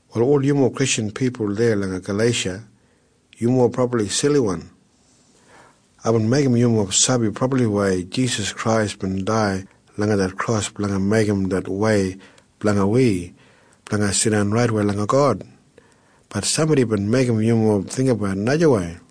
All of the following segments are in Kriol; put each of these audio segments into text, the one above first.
Wal ol yumob Kristjan pipul deya langa Galeisha, yumob brabli siliwan. Aibin meigim yumob sabi brabliwei Jisas Krais bin dai langa det kros blanga meigim det wei blanga wi blanga jidan raitwei langa God. Bat sambodi bin meigim yumob jinggabat najawei.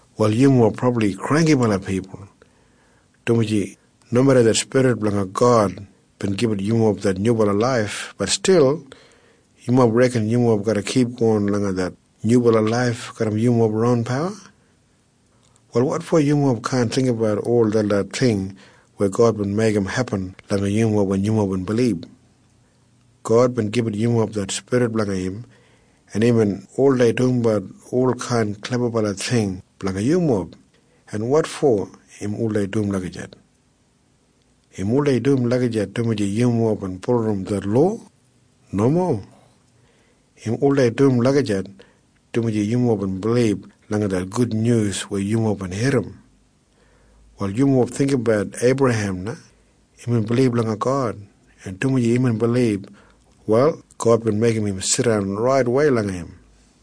Wal yumob brabli granggibala pipul, dumaji nomeda det Spirit blanga God bin gibit yumob det nyubala laif, bat stil yumob reken yumob garra kipgon langa det nyubala laif garram yumob ron pawa. Wal wotfo yumob kaan jinggabat ol detlot ting weya God bin meigim hepin langa yumob wen yumob bin bilib? God bin gibit yumob det Spirit blanga im, en im oldei dumbat olkain klebabala ting blanga yumob. En wotfo im oldei dum lagijat? Im oldei dum lagijat dumaji yumob bin bulurrum det lowa? Nomo. Im oldei dum lagijat dumaji yumob bin bilib langa det gudnyus weya yumob bin irrim. Wal yumob jinggabat Eibrahem na. Imbin bilib langa God, en dumaji imbin bilib, wal God bin meigim im jidan raitwei langa im.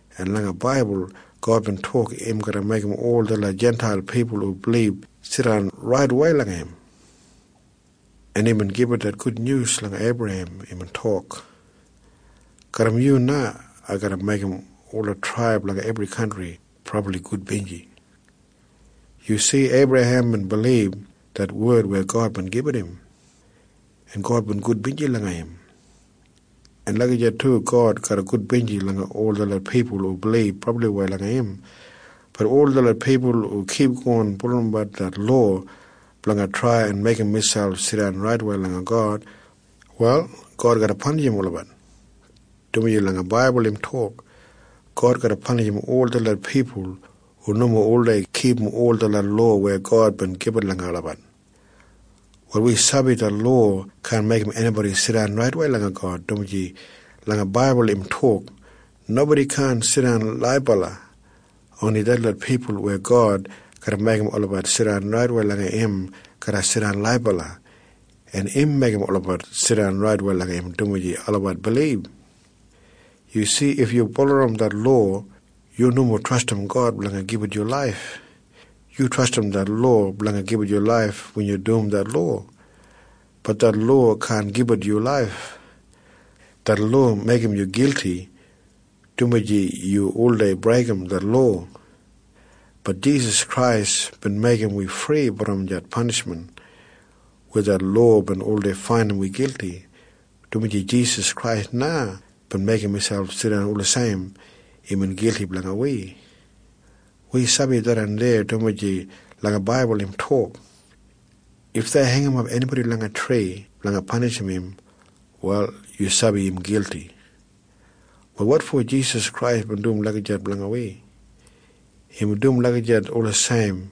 En longtaim langa det oltestaman God bin tok im garra meigim ol detlot Jintail pipul hu bilib jidan raitwei langa im. Det taim na imbin gibit det Gudnyus langa Eibrahem. Imbin tok, “Garram yu na ai garra meigim ola traib langa ebri kantri brabli gudbinji.” Yu si? Eibrahem bin bilib det wed weya God bin gibit im, en God bin gudbinji langa im. En lagijat du God garra gudbinji langa ol detlot pipul hu bilib brabliwei langa im. Bat ol detlot pipul hu kipgon bulurrumbat det lowa blanga trai en meigim miselp jidan raitwei langa God, wal God garra panishim olabat, dumaji langa oltestaman im tok, “God garra panishim ol detlot pipul hu nomo oldei kipum ol detlot lowa weya God bin gibit langa olabat.” Wal wi sabi det lowa kaan meigim enibodi jidan raitwei langa God, dumaji langa oltestaman im tok, “Nobodi kaan jidan laibala. Oni detlot pipul weya God garra meigim olabat jidan raitwei langa im garra jidan laibala, en im meigim olabat jidan raitwei langa im dumaji olabat bilib.” Yu si? If yu bulurrum det lowa, yu nomo trastim God blanga gibit yu laif. Yu trastim det lowa blanga gibit yu laif wen yu dum det lowa. Bat det lowa kaan gibit yu laif. Det lowa meigim yu gilti, dumaji yu oldei breigim det lowa. Bat Jisas Krais bin meigim wi fri brom det panishmen weya det lowa bin oldei faindim wi gilti, dumaji Jisas na bin meigim miselp jidan wulijim imbin gilti blanga wi. En wi sabi tharran deya, dumaji langa oltestaman im tok, “If dei heingimap enibodi langa tri blanga panishim im, wal yu sabi im gilti.” Wal wotfo Jisas Krais bin dum lagijat blanga wi? Imbin dum lagijat wulijim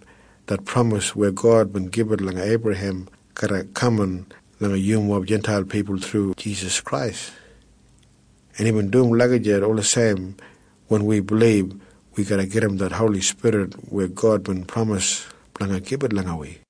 det pramis weya God bin gibit langa Eibrahem garra kaman langa yumob Jintail pipul thru Jisas Krais. En imbin dum lagijat wulijim wen wi bilib, wi garra gedim det Holi Spirit weya God bin pramis blanga gibit langa wi.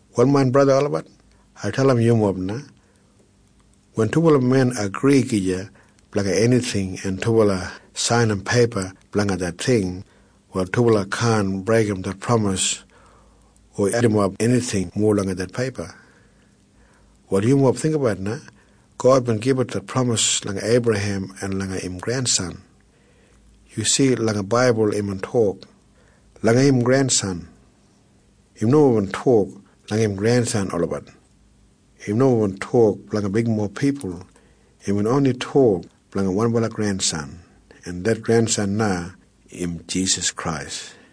Wal main braja en sista olabat, ai dalim yumob na. Wen dubala men agri gija blanga enijing en dubala sainim peipa blanga det ting, wal dubala kaan breigim det pramis o edimap enijing mowa langa det peipa. Wal yumob jinggabat na. God bin gibit det pramis langa Eibrahem en langa im grensan. Yu si? Langa oltestaman imbin tok, “langa im grensan”. Im nomo bin tok, “langa im grensan olabat”. Im nomo bin tok blanga bigmob pipul. Imbin oni tok blanga wanbala grensan. En det grensan na im Jisas Krais.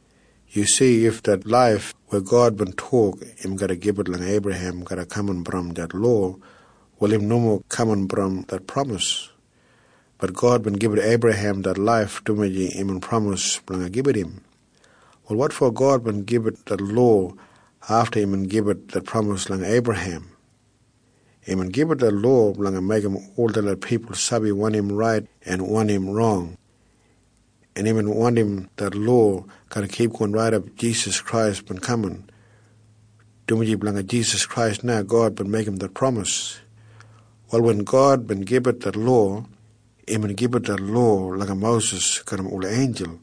Yu si? If det laif weya God bin tok im garra gibit langa Eibrahem bina kaman brom det lowa, wal im nomo bin kaman brom det pramis. Bat God bin gibit Eibrahem det laif dumaji imbin pramis blanga gibit im. Wal wotfo God bin gibit det lowa afta imbin gibit det pramis langa Eibrahem? Imbin gibit det lowa blanga meigim ol detlot pipul sabi wanim rait en wanim rong. En imbin wandim det lowa garra kipgon raidap Jisas Krais bin kaman, dumaji blanga Jisas Krais na God bin meigim det pramis. Wal wen God bin gibit det lowa, imbin gibit det lowa langa Mosis garram ola einjul,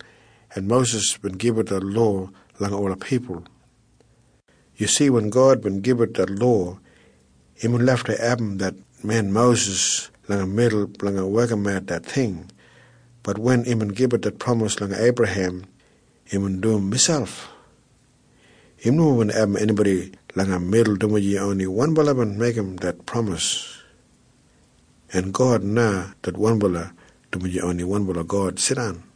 en Mosis bin gibit det lowa langa ola pipul. Yu si? Wen God bin gibit det lowa, imbin lafta abum det men Mosis langa midul blanga wekimat det ting. Bat wen imbin gibit det pramis langa Eibrahem, imbin dum miselp. Im nomo bin abum enibodi langa midul, dumaji oni wanbala bin meigim det pramis. En God na det wanbala, dumaji oni wanbala God jidan.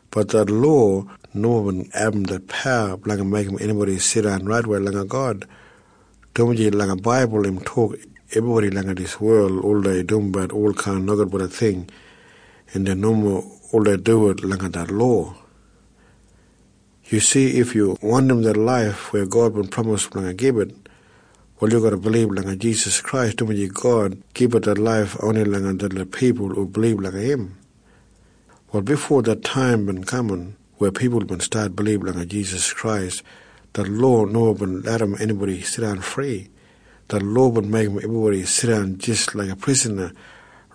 Bat det lowa nomo bin abum det pawa blanga meigim enibodi jidan raitwei langa God, dumaji langa oltestaman im tok ebribodi langa dijan wel oldei dumbat olkain nogudbala ting, en dei nomo oldei duwit langa det lowa. Yu si? If yu wandim det laif weya God bin pramis blanga gibit, wal yu garra bilib langa Jisas Krais, dumaji God gibit det laif oni langa detlot pipul hu bilib langa im. Wal bifo det taim bin kaman weya pipul bin stat bilib langa Jisas Krais, det lowa nomo bin larram enibodi jidan fri. Det lowa bin meigim ebribodi jidan jis laiga prisana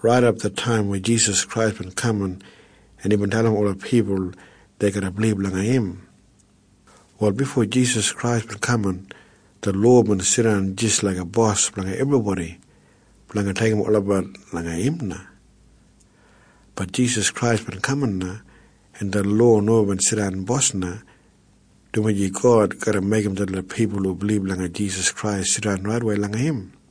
raidap det taim weya Jisas Krais bin kaman en imbin dalim ola pipul dei garra bilib langa im. Wal bifo Jisas Krais bin kaman, det lowa bin jidan jis laiga bos blanga ebribodi blanga deigim olabat langa im na. Bat Jisas Krais bin kaman na, en det lowa nomo jidan bos na, dumaji God garra meigim detlot pipul hu bilib langa Jisas Krais jidan raitwei langa im.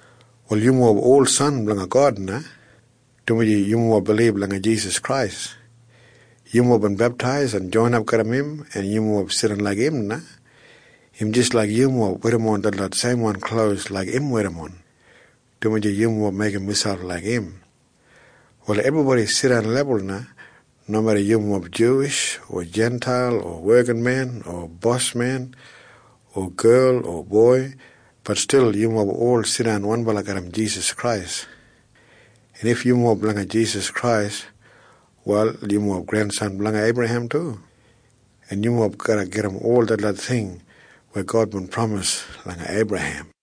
Wal yumob ola san en doda blanga God na, dumaji yumob bilib langa Jisas Krais. Yumob bin beptais en joinap garram im, en yumob jidan laik im na. Im jis laik yumob werrimon detlot seimwan klos laik im werrimon, dumaji yumob meigim miselp laik im. Wal ebribodi jidan lebul na. Nomeda yumob Juwish o Jintail o wekinmen o bosmen o gel o boi, bat stil yumob ol jidan wanbala garram Jisas Krais. En if yumob blanga Jisas Krais, wal yumob grengrensan blanga Eibrahem du, en yumob garra gedim ol detlot ting weya God bin pramis langa Eibrahem.